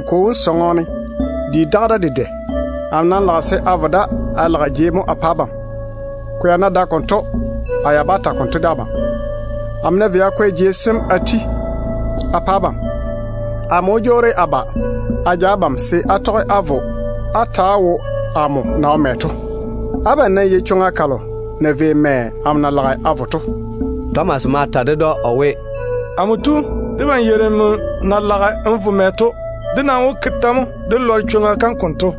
A Kwo wom sɔŋɔ ne, di daga da dedɛ. A nam lage a vo da a kwɛ jei mo a pa abam. Ko ya ná dae chega, a ya bá ta konto de abam. Amo ná vei a kwɛ jei sem a ti a pa abam, a laam wó jwoori a ba a ja abam se á tɔge á vo á ta‑á wo amo na wo mɛ to. Abam nam yei chwoŋa kalo na vei mɛ amo na lage a vo to.” Tomas ma ta ded‑o o we, “Amo tu, debam yeiri nmo na lage n vo mɛ to. Dé nam wó ke tɛ mo dé lɔre ka chwoŋa?”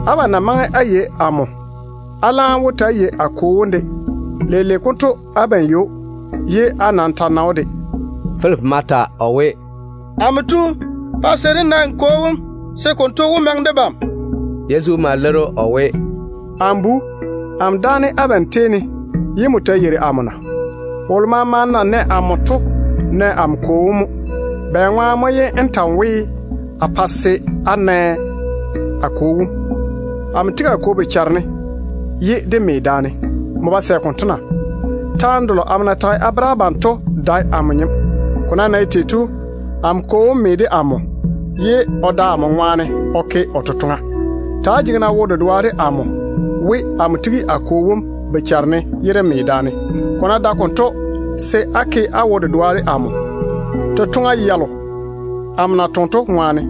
Abam ná maŋe á yei amo, á laam wó ta‑á yei a Kwo wom de. Leile konto abam yei‑o, ye á nam ta nɛ‑o de.” Filipi ma ta o we, “Amo tu, pa se dé lɔre n Kwo wom, se konto wó maŋe debam.” Yezu ma leiri o we, “Filipi, amo dáane abam tei ne ye nmo ta yeiri amo na? Wolo maama na nɛ amo to nɛ amo Kwo wom mo. Bɛŋwaane mo ye n ta n we, a pa se á na a Kwo wom? Amo tigi a Kwo bochare ne ye dé me daane. Nmo nam ba sɛ konto na? Taane delo amo na tage a bere abam to dae amo nyem. Ko nam na ye tei to, amo Kwo wom me de amo, ye o da amo ŋwaane o ke o totoŋa. Ta‑á jege-na wo-dedoa de amo we, amo tigi a Kwo wom bochare ne ye dé me daane. Ko ná dae konto, se á ke á wo-dedoa de amo, totoŋa yalo amo na toŋe to ŋwaane.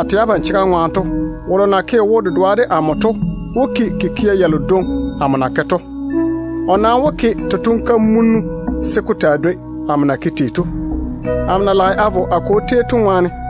A tɛ abam chega ŋwaane to, wolo na ke o wo-dedoa de amo to wó ke kikia yalo dwoŋi amo na ke to. O nam wó ke totoŋ-kamunnu se ko taa dwoi amo na ke tei to, amo na lage a vo a Kwo tei to ŋwaane.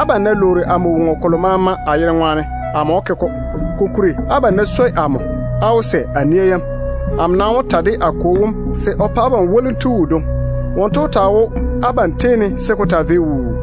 Abam na wó lwoori woŋo kolo maama amo yere ŋwaane to, amo wó ke-ko a pa abam. Abam ná swoi amo, á wó toŋe á tɔge a nia yam. Amo nam wó ta de a Kwo wom se o pa abam Zeinnu wodwoŋi. Wonto wó taa wo abam tei ne se ko taa vei wuu.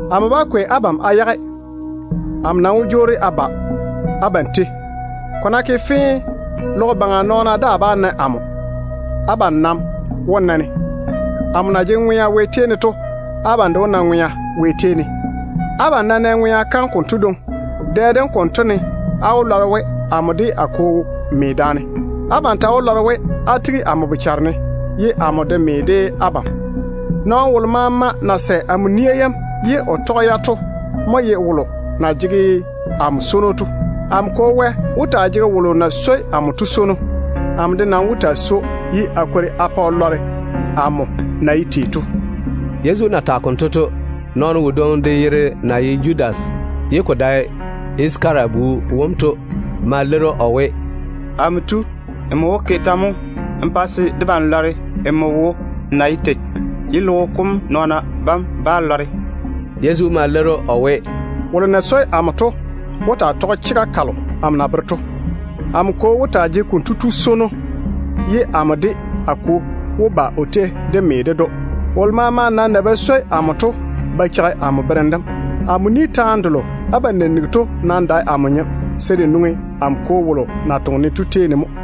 Amo bá kwei abam a yage á yerane. A nam wó jwoori a ba abam tei. Ko ná ke fee, logo baŋa nɔɔna daa bá na amo. Abam nam wó na-ne. Amo na jege ŋwea Wɛ tei ne to, abam de wó na ŋwea Wɛ tei ne. Abam ná nɛ ŋwea kam konto dwoŋi, dɛ dem konto ne á wó lɔre we amo de a Kwo me daane. Abam ta wó lɔre we á tigi amo bochare ne, ye amo de me de abam. Nɔɔno wolo maama na sɛ amo nia yam ye o toŋe o tɔge-ya to mo ye wolo na swoi amo to. Amo Kwo Wɛ wó taa jege wolo na swoi amo to swono. Amo de nam wó taa swoi‑o, ye a kwori a pa o lɔre amo wo na ye tei to.” Yezu na tage konto to, nɔɔno wodwoŋi de yere na ye Judas ye ko dae Yisakara bu wom to ma leiri o we, “Amo tu, nmo wó ke tɛ mo n pa se debam lɔre nmo wo na ye tei, ye logo baŋa nɔɔna bam bá lɔre?” Yezu ma leiri‑o o we, “Wolo na swoi amo to wó taa tɔge chega kalo amo na bere to. Amo Kwo wó taa jege konto tu swono, ye amo de a Kwo wó ba o tei dé me ded‑o. Wolo maama nam na ba swoi amo to ba cheigi amo berem dem. Amo ni taane delo abam na nigi to nam dae amo nyem, se de nwoŋi amo Kwo wolo na toŋe-ne to tei ne mo.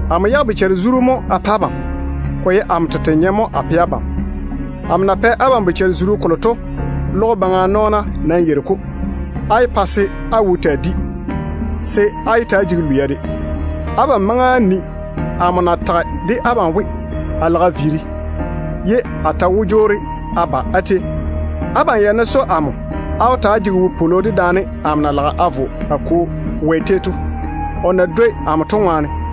Amo yage bochare-zuru mo a pa abam. Ko ye amo tete nyem mo a kwei a pa abam. Amo na lage a pa abam bochare-zuru kolo to, logo baŋa nɔɔna nam yeiri ko dwoŋi. Á yé pa se á bochara taa maga. Á nam yé ta‑á jege lwia de. Abam maŋe á ni amo na tage de abam we, a lage a viiri, ye a ta wó jwoori a ba á tei. Abam ya ná swoi amo, á wó ta‑á jege ywoni dedaane amo na lage a vo a Kwo Wɛ tei to, o na dwoi amo to ŋwaane.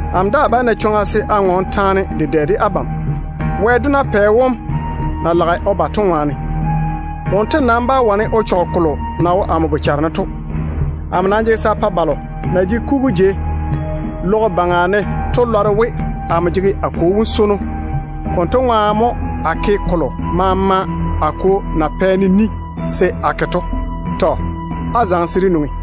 Amo daa bá na chwoŋa se a ŋɔɔne taane dedɛ de abam, logo baŋa dedɛɛro wom na lage o ba to ŋwaane. Wonto nam bá wane o dwoni de amo. Amo nam jege se a pa balo na jege kugu jei logo baŋa ne to lɔre we, amo jege a Kwo wom swono. Konto ŋwaane mo a ke kolo maama a Kwo na pɛ-ne ni se a ke to. Á nam zaŋe-na ywo-seeni se dé viiri.”